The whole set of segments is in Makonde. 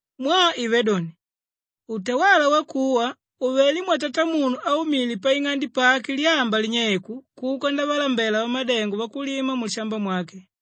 “Mwaa ivé doni, utawala wakuwa uvelé mwatatamunu áumile paing'ande pake lyamba linyeiku kuka ndavalambela vamadengo vakulima mulishamba mwake.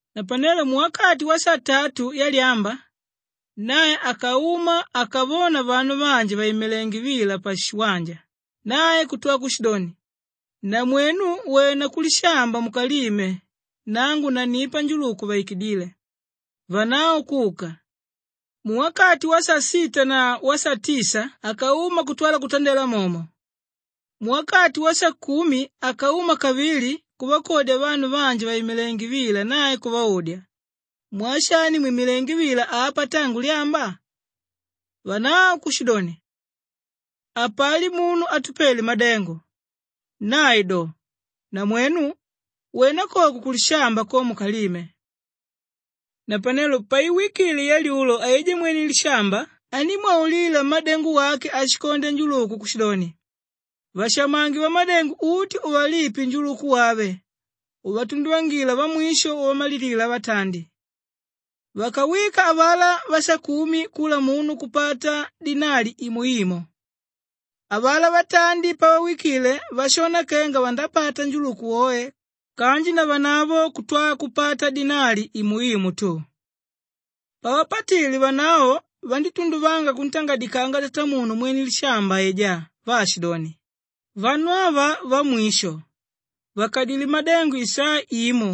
Napanelo muwakati wasatatu yalyamba, nae akauma akavona vanu vanji vàimilenge vila pashiwanja nae kutwa kushidoni, ‘Namwenu, wena kulishamba mukalime nangu nannipa njuluku uvaikidíle.’ Vanavo kuka. Muwakati wasasita na wasatisa akauma kutwala kutandela momo. Muwakati wasakumi akauma kavili kuvakodya vanu vanji vàimilenge vila nae kuvaudya, ‘Mwaa shani mwimilengé vila apa tangu lyamba?’ Vanavo kushidoni, ‘Hapali munu átupele madengo.’ Nae do, ‘Namwenu, wena koko kulishamba ko mukalime.’ “Napanelo paiwikile yalyulo aijá mwene lishamba andímwaulila mmádengo wake áshikondya njuluku kushidoni, ‘Vashamange vamadengo uti uvalipe njuluku wave uvatunduvangila vamwisho uvamalilila vatandi.’ Vakawika avalá vasakumi kula munu kupata dinali imo imo. Avalá vatandi pavawikile vashona kenga vandapata njuluku woe kanji navanavo kutwala kupata dinali imo imo tu. Pavapatile vanavo vandítunduvanga kuntangadikanga tatamunu mwene lishamba aijá vaashidoni, ‘Vanu ava vamwisho vakadilé madengo isaa imo,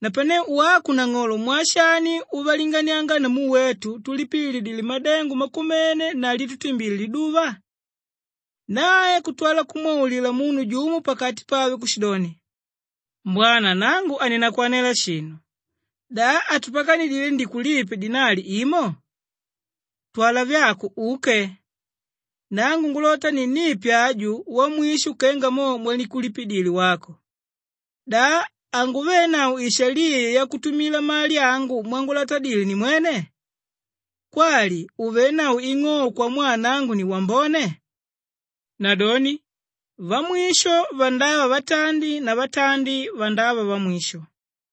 napane wako nang'olo mwaa shani uvalinganianga namu wetu túlipililidile madengo makumene na lítutimbile liduva?’ “Nae kutwala kumwaulila munu jumo pakati pave kushidoni, ‘Mbwana nangu haninakwanela shinu. Da hatupakanidile ndikulipe dinali imo? Twala vyako uke! Nangu ngulota ninnipe aju wamwisho kenga mo mwandikulipidile wako. Da hanguvenavo shaliya yakutumila mali angu mwangulatela nimwene? Kwali uvénavo ing'ou mwaa nangu ni wambone?’ Nadoni vamwisho vandava vatandi na vatandi vandava vamwisho.”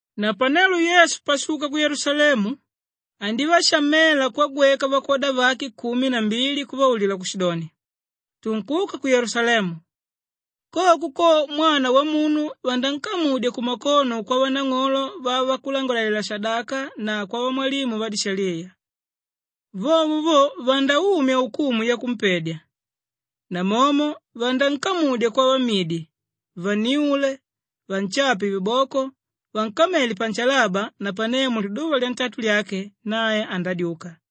Napanelo Yesu pashuka ku Yelusalemu andívashamela kwagweka vakwoda vake kumi na mbili kuvaulila kushidoni, “Tunkuka ku Yelusalemu. Koko ko, Mwana Wamunu vanankamudya kumakono kwavanang'olo vavakulangalalela-shadaka na kwavamwalimu vadishaliya. Vovo vo, vandaumya ukumu yakumpedya namomo vanankamudya kwavamidi vanniule, vanshape viboko, vankamele panshalaba napane muliduva lyatatu lyake nae andadyuka.”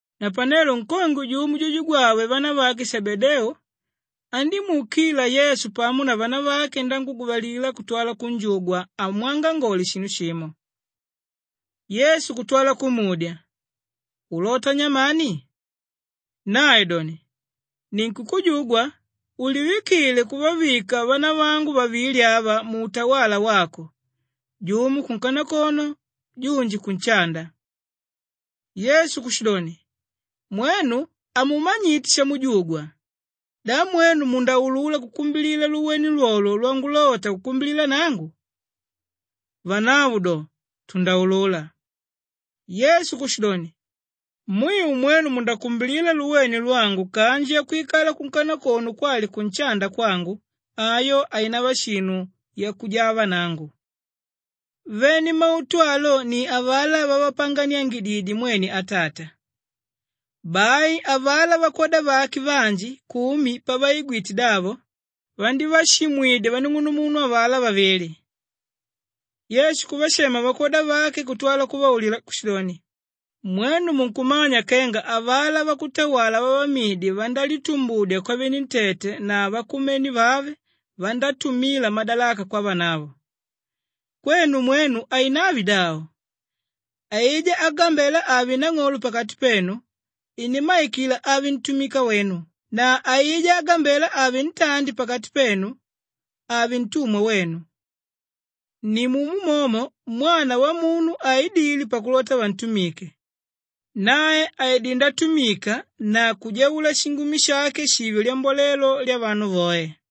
Napanelo nkongwe jumo jujugwave vanavake Shebedeu andímuukila Yesu pamo na vanavake nanguguvalila kutwala kunjugwa amwangangole shinu shimo. Yesu kutwala kumudya, “Ulota nyamani?” Nae doni, “Ninkukujugwa ulivikile kuvavika vanavangu vavili ava muutawala wako, jumo kunkanakono junji kunshanda.” Yesu kushidoni, “Mwenu hamumanyite shamujugwa. Da mwenu mundaulula kukumbila luwene lwolwo lwangulota kukumbila nangu?” Vanavo do, “Tundaulula.” Yesu kushidoni, “Mwiu mwenu mundakumbila luwene lwangu kanji yakwikala kunkanakoko kwali kunshanda kwangu, ayo hainava shinu yakujava nangu. Vene mautu alo ni avalá vavapanganiangididye mwene Atata.” Bai avalá vakwoda vake vanji kumi pavaigwite davo, vandívashimwidya vanung'unumunu avalá vavili. Yesu kuvashema vakwoda vake kutwala kuvaulila kushidoni, “Mwenu munkumanya kenga avalá vakutawala vavamidi vandálitumbudya kwavenentete na vakumene vave vandátumila madalaka kwavanavo. Kwenu mwenu hainave davo. Aijá ágambela ave nang'olo pakati penu inimmaikila ave ntumika wenu na aijá ágambela ave ntandi pakati penu ave ntumwa wenu. Nimumo momo Mwana Wamunu haidile pakulota vantumike; nae aidilé ndatumika na kujaula shingumi shake shive lyambolelo lyavanu voe.”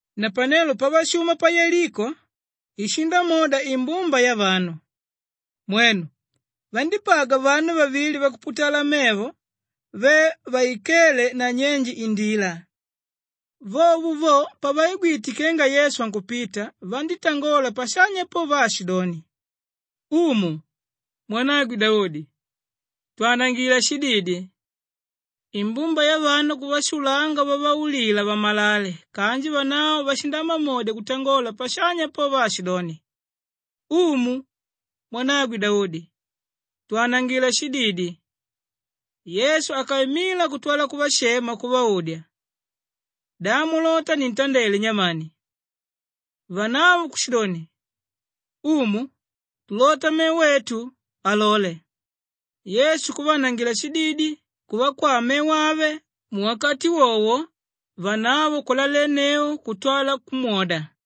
Napanelo pavashuma pa Yeliko, ishindamwoda imbumba yavanu. Mwenu! Vandípagwa vanu vavili vakuputala mevo ve vaikéle nanyenje indila. Vovo vo, pavaigwite kenga Yesu ankupita vanditangola pashanya po vaashidoni, “Umu, mwanagwe Daudi, twanangila shididi!” Imbumba yavanu kuvashulanga vavaulila vamalale kanji vanavo vashindamamodya kutangola pashanya po vaashidoni, “Umu, mwanagwe Daudi, twanangila shididi!” Yesu akaimila kutwala kuvashema kuvaudya, “Da mulota nintandele nyamani?” Vanavo kushidoni, “Umu, tulota mevo etu, alole!” Yesu kuvaanangila shididi, kuvakwaa mevo ave, muwakati wowo vanavo kulalenneu kutwala kumwoda.